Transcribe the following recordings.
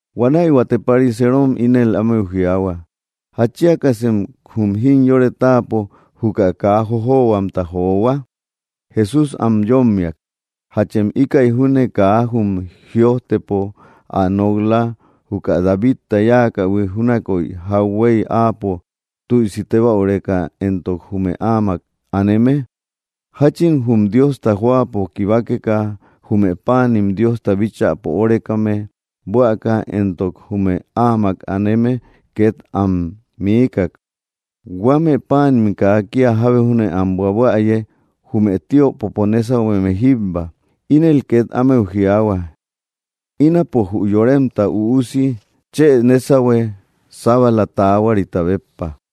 Huanäi huate pariseerom ínel ámeu jiaahua: —¿Jatchiakasem jum jimyore táapo juka kaa jojohuamta johua? Jesús am yómmiak: —¿Jachem íkäi júne kaa jum jïojtepo ä nok‑la juka Davidta yáakähui júnakoy jauhuey áapo tüisi tébäureka éntok jume áamak aneme? Jáchin jum Diosta jóapo kibakeka jume páanim Diosta bíchäpo órekame, buäka, éntok jume áamak aneme két am miikak, huame páanim kaa kía jábe júne am buabuäye jume tiöpopo nésahueme jíbba. Ínel két ámeu jiaahua: —Ínapo jü Yoremta Üusi chë nésahue sábala taahuarita béppa.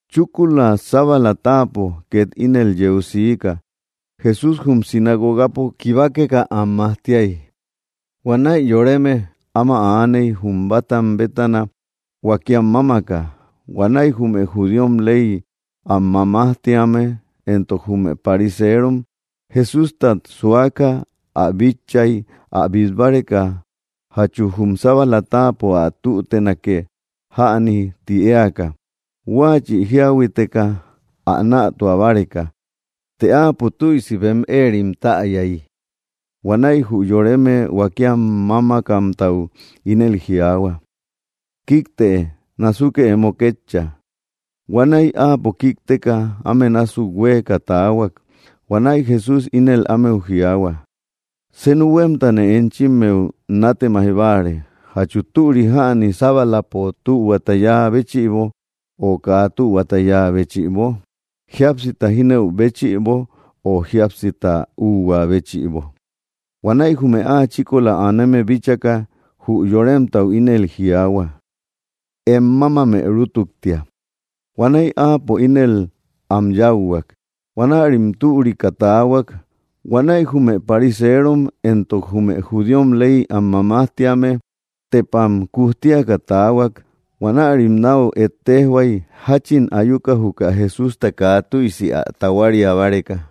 Chúkula sábala táapo két ínel yeu siika, Jesús jum sinagogapo kibakeka am majtiay. Huanäi yoreme áma aaney jum bátam bétana huakiam mámaka; huanäi jume judíom ley am mamajtíame éntok jume pariseerom Jesústat suaka ä bitchay, ä bít báreka jachu jum sábalapo ä tútenake jäni ti éaka, huáachï jíahuiteka ä nätua báreka. Të áapo tüisi bem éerim täyay, huanäi jü yoreme huakiam mámakamtau ínel jiaahua: —Kíktëe, násukë emo kétcha. Huanäi áapo kíkteka, áme násuk huéeka taahuak. Huanäi Jesús ínel ámeu jiaahua: —Senu huémtane enchimmeu nátemaij báare: ¿Jachu türi jäni sábalapo tühuata yáa béchïbo, o kaa tühuata yáa béchïbo? ¿Jíapsita jínëu béchïbo, o jíapsita úhua béchïbo? Huanäi jume áa chíkola aneme bíchaka, jü yoremtau ínel jiaahua: —Em mámamë rútuktia. Huanäi áapo ínel am yáuhuak. Huanärim türika taahuak. Huanäi jume pariseerom éntok jume judíom ley am mamajtíame tepam kujtiaka taahuak. Huanärim náu ejtejhuay, jáchin ayuka juka Jesústa kaa tüisi ä tahuaria báreka.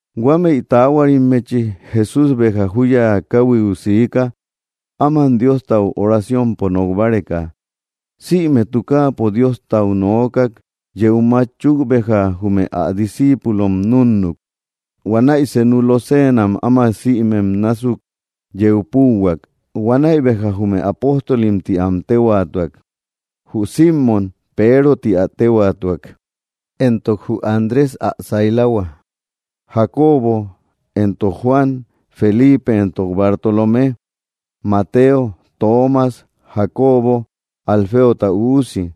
Huamëi taahuarimmechi Jesús béja júya káhuiu siika, áman Diostau oraciompo nok báreka. Sïme tukaapo Diostau nookak. Yeu mátchuk béja, jume ä discíipulom núnnuk. Huanäi senu loseenam áma sïmem násuk yeu púuhuak. Huanäi béja jume apóstolim ti am téhuaatuak: Jü Símon, Peero ti ä téhuaatuak, éntok jü Andrés ä sailahua, Jacobo éntok Juan, Felipe éntok Bartolomé, Mateo, Toomas, Jacobo Alfeota üusi,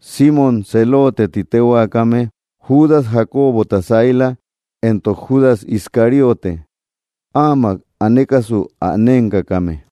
Símon Zeloote ti téhuaakame, Judas Jacobota saila, éntok Judas Iscariote, áamak anekasu ä nénkakame.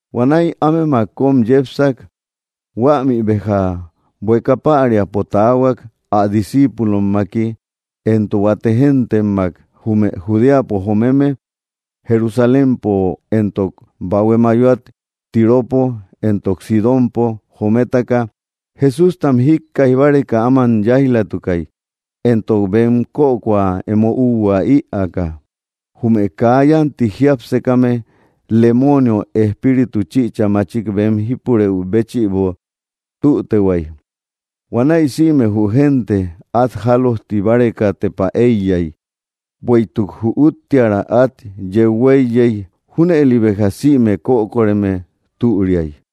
Huanäi ámemak kóm yepsak. Huämï béja bueka päriapo taahuak, ä discíipulommaki éntok huate géntemmak jume Judeapo jomeme, Jerusalémpo éntok bahue mayoat Tiropo éntok Sidónpo jomemtaka. Jesústam jíkkaij báreka áma yáij‑latukay, éntok bem kökoa emo úhua ïaaka. Jume kaa yánti jiápsekame, lemoonio espíritu chïcha machik bem jípurë béchïbo tütehuay. Huanäi sïme jü génte át jálojti báreka tepa éiyay, bueïtuk jü úttiära át yeu huéiyey. Júnëli béja sïme kökoreme türiay.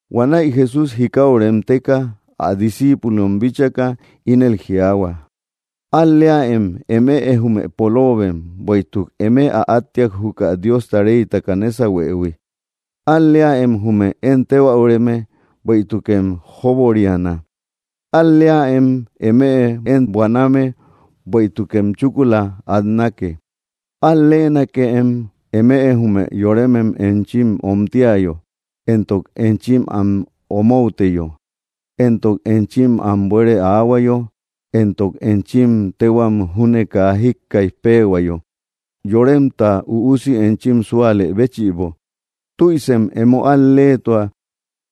Huanäi Jesús jikau remteka ä discíipulom bíchaka, ínel jiaahuak: —Al‑leäem eme jume poloobem, bueïtuk eme ä áttiak juka Diosta reytaka nésahuëhui. ’Al‑leäem jume én tébäureme, bueïtukem jóboriana. ’Al‑leäem eme én buaname, bueïtukem chúkula atnake. ’Al‑leenakëem eme jume yoremem enchim omtiayo, éntok enchim am omouteyo, éntok enchim am bueere aahuayo, éntok enchim téhuam júne kaa jíkkaij péehuayo, Yoremta Üusi, enchim súalë béchïbo. Tüisem emo al‑leetua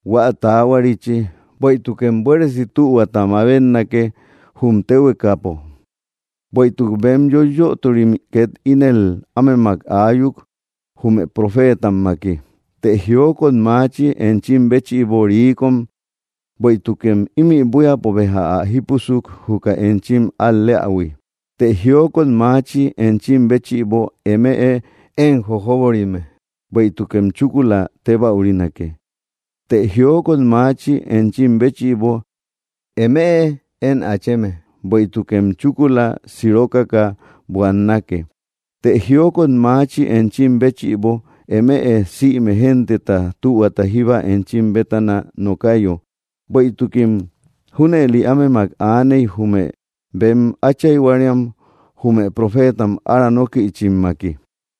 hua taahuarichi, bueïtukem buéresi tühuata mabetnake jum téhuekapo. Bueïtuk bem yoiyöturim két ínel ámemak aayuk, jume profeetammaki. ’Të jiokot machi enchim béchïbo, riikom, bueïtukem ímï buíapo béja ä jípusuk, juka enchim al‑leähui. ’Të jiokot machi enchim béchïbo, eme én jojóborime, bueïtukem chúkula tébäurinake. ’Të jiokot machi enchim béchïbo, eme én acheme, bueïtukem chúkula sirokaka buannake. ’Të jiokot machi enchim béchïbo, eme sïme genteta tühuata jíba enchim bétana nokayo, bueïtukim junëli ámemak aaney, jume bem áchayhuarim jume profeetam ára nókïchimmaki.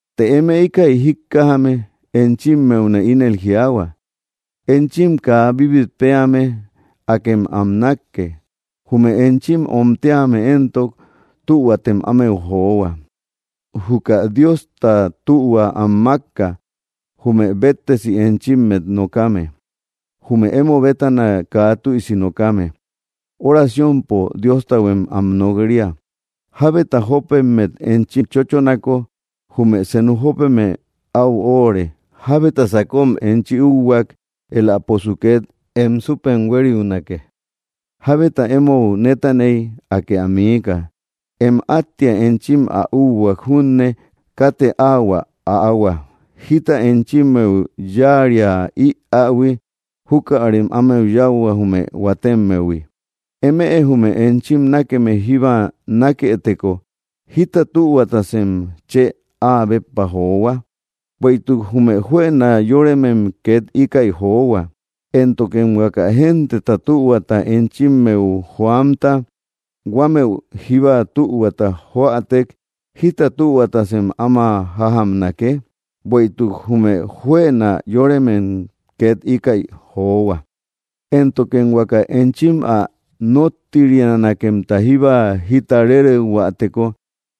’Të eme íkäi jíkkajame, enchimmeune ínel jiaahua: Enchim kaa bíbit péame, akem am nákke. Jume enchim omtíame éntok, tühuatem ámeu johua. Juka Diosta tuhua am makka, jume béttesi enchimmet nokame. Jume emo bétana kaa tüisi nokame, oraciompo Diostahuem am nok‑ria. Jábeta jópemmet enchi chóchonako, jume senu jópeme au óóre. Jábeta sakom enchi úhuak, éläposu két em súpem huériunake. Jábeta émou nétaneyo, Akë ä miika. Em áttia enchi ä úhuak junne, katë áu ä äahua. Jíta enchimmeu yáaria ïähui, júkärem ámeu yáuhua, jume huatemmehui. ’Eme jume enchim nákeme jíba nákëteko, ¿jita tühuatasem chë áa béppa johua? Bueïtuk jume juëna yóremem két íkäi johua. Éntokem huaka genteta tühuata enchimmeu joamta, huame jíba tühuata joätek, ¿jita tühuatasem áma jájamnake? Bueïtuk jume juëna yóremem két íkäi johua. Éntokem huaka enchim ä nóttirianakemta jíba jita réreuhuäteko,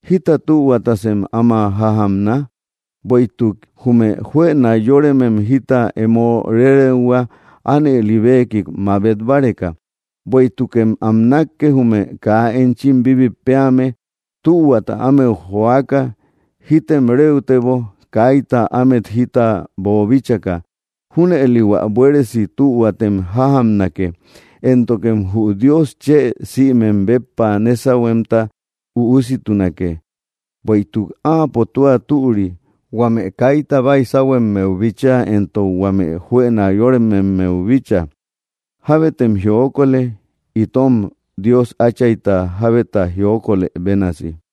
¿jita tühuatasem áma jájamna? Bueïtuk jume juëna yóremem jita emo réreuhua, ánëli beekik mabet báreka. Bueïtukem am nákke, jume kaa enchim bíbit péame, tühuata ámeu joaka. Jítem réutebo, kaita ámet jita boobíchaka. Júnëli hua buéresi tühuatem jájamnake. Éntokem jü Dios chë sïmem béppa nésahuemta üussitunake. Bueïtuk áapo tua türi, huame kaita baysahuemmeu bíchaa, éntok huame juëna yorememmeu bíchaa. Jábetem jiokolë, itom Dios Áchayta jábeta jiokolë bénasi.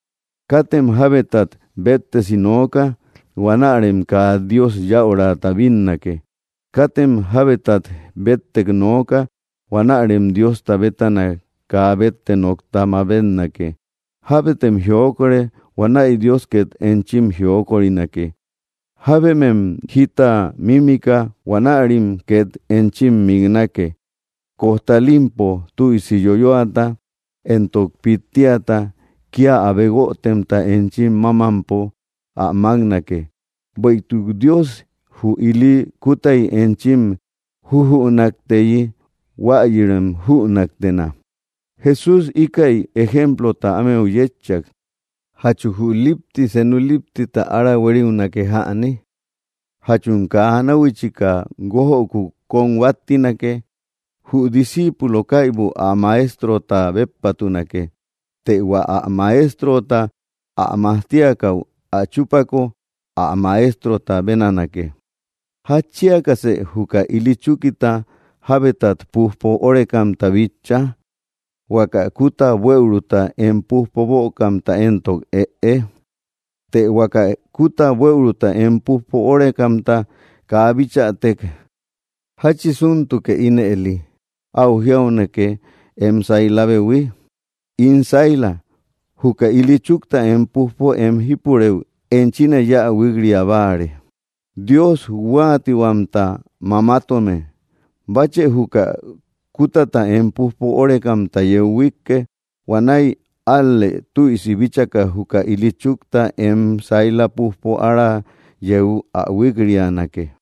’Katem jabetat bettesi nooka, huanärem kaa Dios yäurata bínnake. Katem jábetat bettek nooka. Huanärem Diosta bétana kaa bette nokta mabetnake. Jábetem jiokore. Huanäi Dios két enchim jiokorinake. Jábemem jita mímika. Huanärim két enchim miknake. Kojtalimpo, tüisi yoyoata éntok pittiata kía abe guötemta enchim mámampo ä máknake. Bueïtuk Dios jü ili kútay enchim jujünakteyi, huayïrem jünaktena. Jesús íkäi ejemplota ámeu yétchak: —¿Jachu jü lípti senu líptita ára huériunake jäni? ¿Jachum kaa náhuichika guójöku kóm huáttinake? Jü disciipulo kaibu ä maestrota béppatunake. Të hua ä maestrota ä majtiakäu ä chúpako, ä maestrota bénanake. ’¿Jatchiakasë juka ili chúkita jabetat pújpo órekamta bitcha, huaka kúta buëuruta em pújpo bökamta éntok, ëe? Të huaka kúta buëuruta em pújpo órekamta kaa bitchatek. ¿Jáchisintuke ínëli áu jiaunake em sailabehui: “In saila, juka ili chúkta em pújpo em jípurëu, enchine yáa huík‑ria báare”? ¡Dios huatihuamta mamatome! Báchë juka kútata em pújpo órekamta yeu huikke. Huanäi ál‑lë tüisi bíchaka juka ili chúkta em saila pújpo ára yeu ä huikrianake.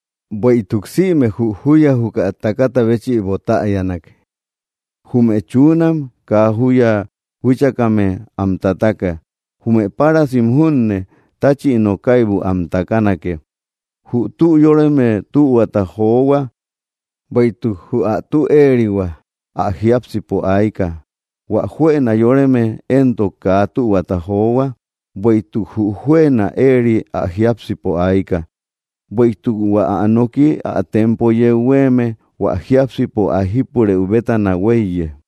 Bueïtuk sïme jü júya juka takata béchïbo táyana: Jume chunam kaa júya huíchakame am tataka; jume párasim júne táchïno kaibu am takanake. Jü tü yóreme tühuata johua, bueïtuk jü ä tü éerihua ä jiápsipo ayka. Huä juëna yoreme éntok, kaa tühuata johua, bueïtuk jü juëna éeri ä jiápsipo ayka. Bueïtuk hua ä noki ä tempo yeu huéeme hua jiápsipo ä jípurë bétana huéiye.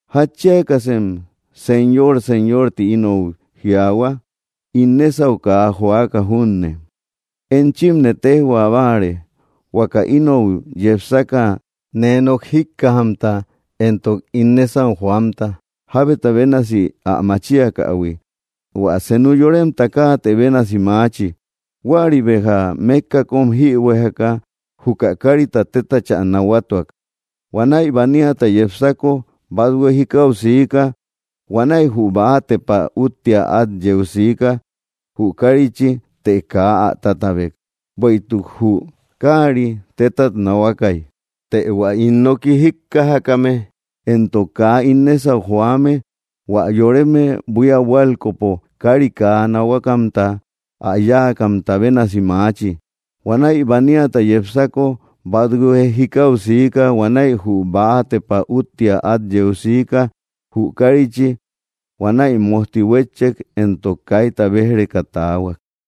’¿Jatchiakasem, “Señor, Señor”, ti inou jiaahua, ín nésau kaa joaka junne? Enchimne téjhua báare, huaka inou yepsaka nee nok jíkkajamta éntok ín nésau joamta, jábeta bénasi ä machiakähui: hua senu yoremta káatë bénasi maachi. Huäri béja mékka kóm jïbuejeka, juka kárita tétachä nahuatuak. Huanäi baniata yepsako, bathue jikau siika. Huanäi jü bäa tepa úttia át yeu siika, jü kárichi, të kaa ä tátabek, bueïtuk jü kári tétat nahuakäy. Të hua ín nooki jíkkajame éntok kaa ín nésau joame, hua yoreme buía buálkopo kári kaa nahuakamta ä yáakamta bénasi maachi. Huanäi baniata yepsako, bathue jikau siika. Huanäi jü bäa tepa úttia át yeu siika, jü kárichi. Huanäi mójti huétchek, éntok kaita béj‑reka taahuak.